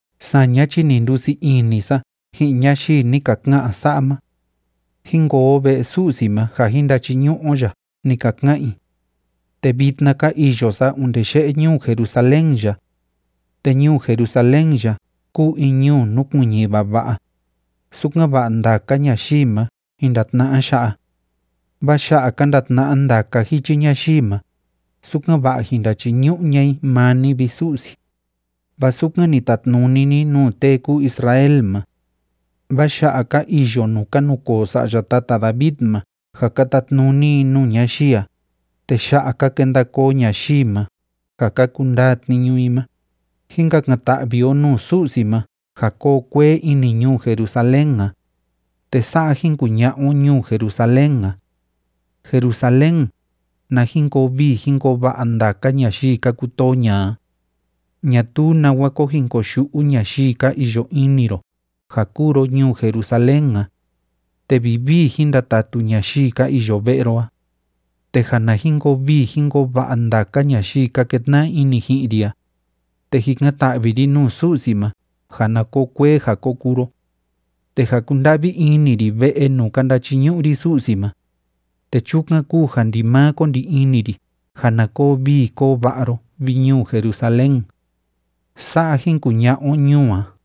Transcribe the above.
Saña chi ni ndusii ini sa ji'in ñayii ni ka ka'an sa'a ma: “Jín koo o ve'e Su'si ma ja jín ndachiñu'u o ya”, ni ka ka'an i. Te vitna ka iyo sa onde ye'e ñuu Jerusalén ya. Te ñuu Jerusalén ya kúu in ñuu núkuiñi vava'a, sukan‑va'a ndaka ñayii ma jin ndatna'a ya'a. Vaa ya'a ka ndatna'a ndaka jichi ñayii ma, sukan‑va'a jin ndachiñu'u ña'a i maa ni, vi Su'si, vaa sukan ni tatnuni ni nuu tee kúu Israel ma. Vaa ya'a ka iyo nuu ka nukoo sa'ya tata David ma ja ka tatnuni i nuu ñayii a, te ya'a ka kenda koo ñayii ma ja ka kundaa tniñu i ma. Jín kakan‑ta'vi o nuu Su'si ma ja koo kuee ini ñuu Jerusalén a, te sa'a jín kuña'a o ñuu Jerusalén a: “Jerusalén, na jin koo vii jín koo va'a ndaka ñayii ka kutoo ña'a a. Ñatuu nawa ko jin koyu'u ñayii ka iyo ini ro ja kúu ro ñuu Jerusalén a, te vivii jín ndatatu ñayii ka iyo ve'e ro a. Te ja na jin koo vii jín koo va'a ndaka ñayii ka ketna'a ini ji'in ri a, te jikan‑ta'vi ri nuu Su'si ma ja na koo kuee ja ko kuu ro. Te ja kúnda'vi ini ri ve'e nuu ka ndachiñu'u ri Su'si ma, te chukan kúu ja ndimaa ko ndi ini ri ja na koo vii koo va'a ro vi, ñuu Jerusalén.” Sa'a jin kuña'a o ñuu a.